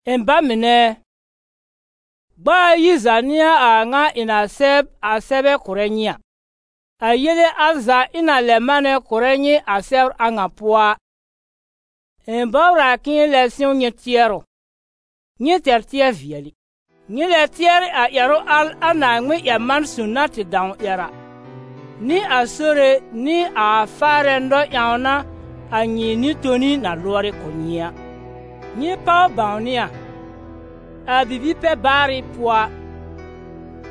Ɩ̃ ba mɩnɛ ɛ, gb'a ayi za n'ɩ a a ŋa ɩ̃ na sɛb a sɛbɛ kʋrɛ nyɩ a. A yele al za ɩ̃ na lɛ manɛ kʋ̀rɛ nyɩ a sɛbr a ŋa pʋɔ a, ɩ̃ bɔbr a k'ɩ̃ɩ lɛb sɩ̃w nyɩ tɩɛrʋ, nyɩ tɛr tɩɛr-vɩɛlɩ. Nyɩ lɛ tɩɛrɩ a ƴɛrʋ al a Naaŋmɩn-ƴɛr-man- son na tɩ dãw ƴɛr a, nɩ a Sore nɩ a Faarɛ nɔ-ƴãwna a nyɩ nɩ-toni na lʋɔrɩ kʋ̀ nyɩ a. Nyɩ páw bãwnɩ a, a bibi-pɛ-baarɩ pʋɔ a,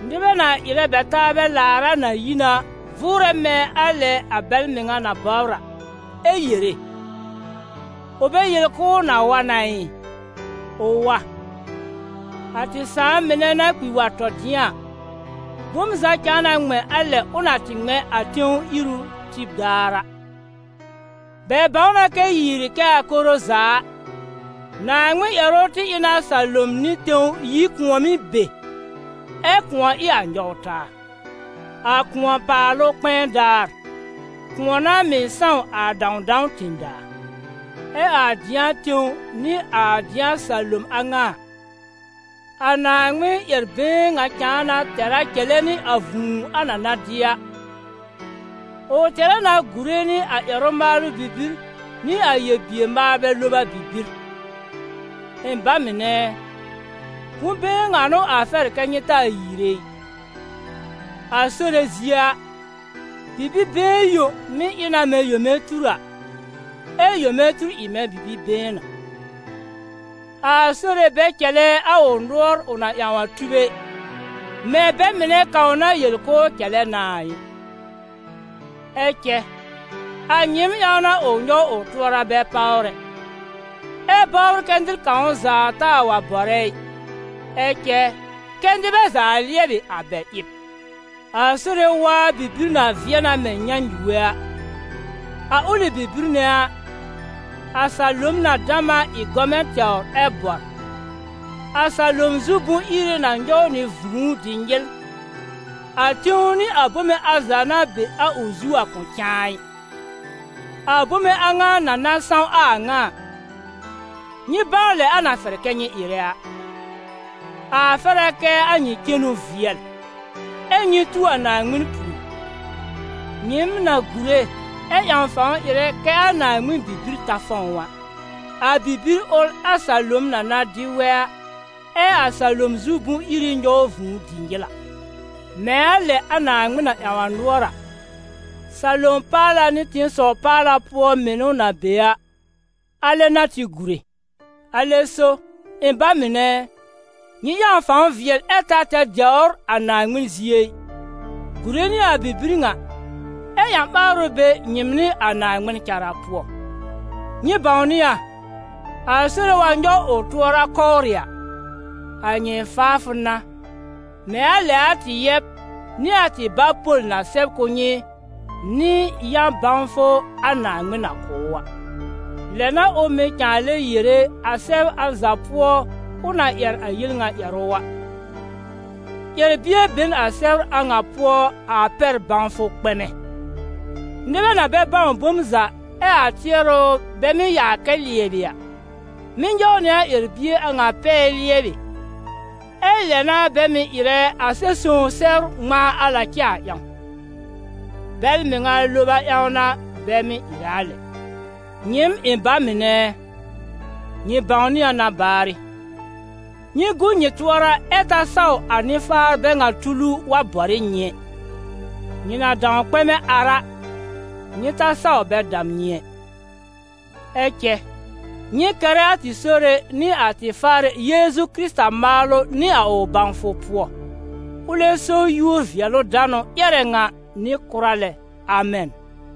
nɩbɛ na ɩrɛ bɛ taabɛ laar a, na yi na, vʋʋrɛ mɛ̃ a lɛ bɛl mɩŋa na bɔbr a, ɛ yere: «Ʋ bɛ yel k'ʋʋ na wa na ɩ? Ʋ wa? A tɩ sãà mɩnɛ na kpi wa tɔ dɩ̃a a, bom za cãa na ŋmɛ̃ a lɛ ʋ na tɩ ŋmɛ̃ a tẽw iru tib daar a.» Bɛ bãw na kɛ yiiri kɛ a koro za a, Naaŋmɩn ƴɛrʋ tɩ ɩ na salom nɩ tẽw yi kʋ̃ɔ̀mɩ́ be, ɛ kʋ̃ɔ ɩ a nyɔw taa. A kʋ̃ɔ-paalʋ kpɛ̃ɛ daar, kʋ̃ɔ n'a mɩ̀ sãw a dãwdãw tẽ-daa. Ɛ a dɩ̃a tẽw nɩ a dɩ̃a salom a ŋa a, a Naaŋmɩn ƴɛr-been ŋa cãa na tɛr a cɛlɛ nɩ a vũu a na na dɩ a, ʋ tɛr a na gùre nɩ a ƴɛrʋ-maalʋ bibir nɩ a yel-bier-maalbɛ loba bibir. Ɩ̃ ba mɩnɛ ɛ, bʋ̃-been ŋa n'ʋ a fɛr kɛ́ nyɩ taa yiire ɩ: a Sore zie a, bibir been yõ mɩ́ ɩ na mɛ̃ yome tur a, ɛ yome tur ɩ mɛ̃ bibir been a. A Sore bɛ cɛlɛ a ʋ nʋɔr ʋ na ƴãw a tub ɛ, mɛ̃ bɛ mɩnɛ kãw na yel k'ʋʋ cɛlɛ na a ɩ. Ɛ cɛ, a nyɩɩm ƴãw n'a ʋ nyɔw ʋ tʋɔra bɛ páwr ɛ, ɛ́ bɔbr kɛ nɩr kãw za taa wa bɔrɛ ɩ, ɛ cɛ, kɛ nɩbɛ za lɩɛbɩ a bɛ ɩb. A Sore waa bibir na vɩɛ na mɛ̃ nyãnyuge a, a ʋlɩ bibir nɛ a, a salom na dam a ɩ gɔmɛ̃ tɛwr ɛ bɔr, a salom zu bʋ̃-iri na nyɔw nɩ vũu dɩ nyɩl, a tẽw nɩ a bome al za na be a ʋ zu a kʋ̃ cãa ɩ. A bome a ŋa na na sãw a ŋa a, nyɩ bãw lɛ a na fɛr kɛ nyɩ ɩrɛ a. A fɛr a kɛ a nyɩ cenu vɩɛl, ɛ nyɩ tu a Naaŋmɩn pùor, nyɩɩm na gùre ɛ ƴãw fãw ɩrɛ kɛ a Naaŋmɩn bibir ta fɔ̃w a. A bibir ʋl a salom na na dɩ wɛ a, ɛ a salom zu bʋ̃-iri nyɔw vũu dɩ nyɩl a. Mɛ̃ a lɛ a Naaŋmɩn na ƴãw nʋɔr a, salom paala nɩ tẽsɔw paala pʋɔ mɩnʋ na be a, alɛ n'a tɩ gùre. Alɛ so, ɩ̃ ba mɩnɛ ɛ, nyɩ ƴãw fãw vɩɛl ɛ ta tɛr dɛwr a Naaŋmɩn zie ɩ, gùre nɩ a bibir ŋa, ɛ ƴã-ɓaarʋ be nyɩɩm nɩ a Naaŋmɩn cara pʋɔ. Nyɩ bãwnɩ a, a Sore wa nyɔw ʋ tʋɔra kɔwrɩ a, a nyɩ faafʋ n'a, mɛ̃ a lɛ a tɩ yɛb nɩ a tɩ bá Pol na sɛb kʋ̀ nyɩ nɩ a yã-bãwfʋ a Naaŋmɩn na kʋ̀ ʋ a. Lɛ n'a ʋ mɩ̀ cãa lɛ yere, a sɛbr al za pʋɔ ʋ na ƴɛr a yel ŋa ƴɛrʋ a. Ƴɛr-bie be n a sɛbr a ŋa pʋɔ a pɛr bãwfʋ kpɛmɛ; nɩbɛ na bɛ bãw bom za ɛ a tɩɛrʋ bɛ mɩ́ yaa kɛ lɩɛbɩ a, mɩ́ nyɔw nɩ a ƴɛr-bie a ŋa pɛɛ lɩɛbɩ, ɛ lɛ n'a bɛ mɩ̀ ɩrɛ a Sɛb-sõw sɛbr ŋmãa al na cɛ a ƴãw. Bɛl mɩŋa loba ƴãw n'a bɛ mɩ́ ɩrɛ a lɛ. Nyɩɩm ɩ̃ ba mɩnɛ ɛ, nyɩ bãwnɩ a na baarɩ: nyɩ gu nyɩ tʋɔra ɛ ta saw a nɩ-faar bɛ ŋa tulu wa bɔr ɩ nyɩ ɛ; nyɩ na dãw kpɛ̃mɛ ar a, nyɩ ta saw bɛ dam nyɩ ɛ. Ɛ cɛ nyɩ kɛrɛ a tɩ Sore nɩ a tɩ Faarɛ Yeezu Kɩrɩta maalʋ nɩ a ʋ bãwfʋ pʋɔ. Ʋlɛ so yúor-vɩɛlʋ-danʋ ƴɛrɛ ŋa nɩ kʋra lɛ. Amɛn.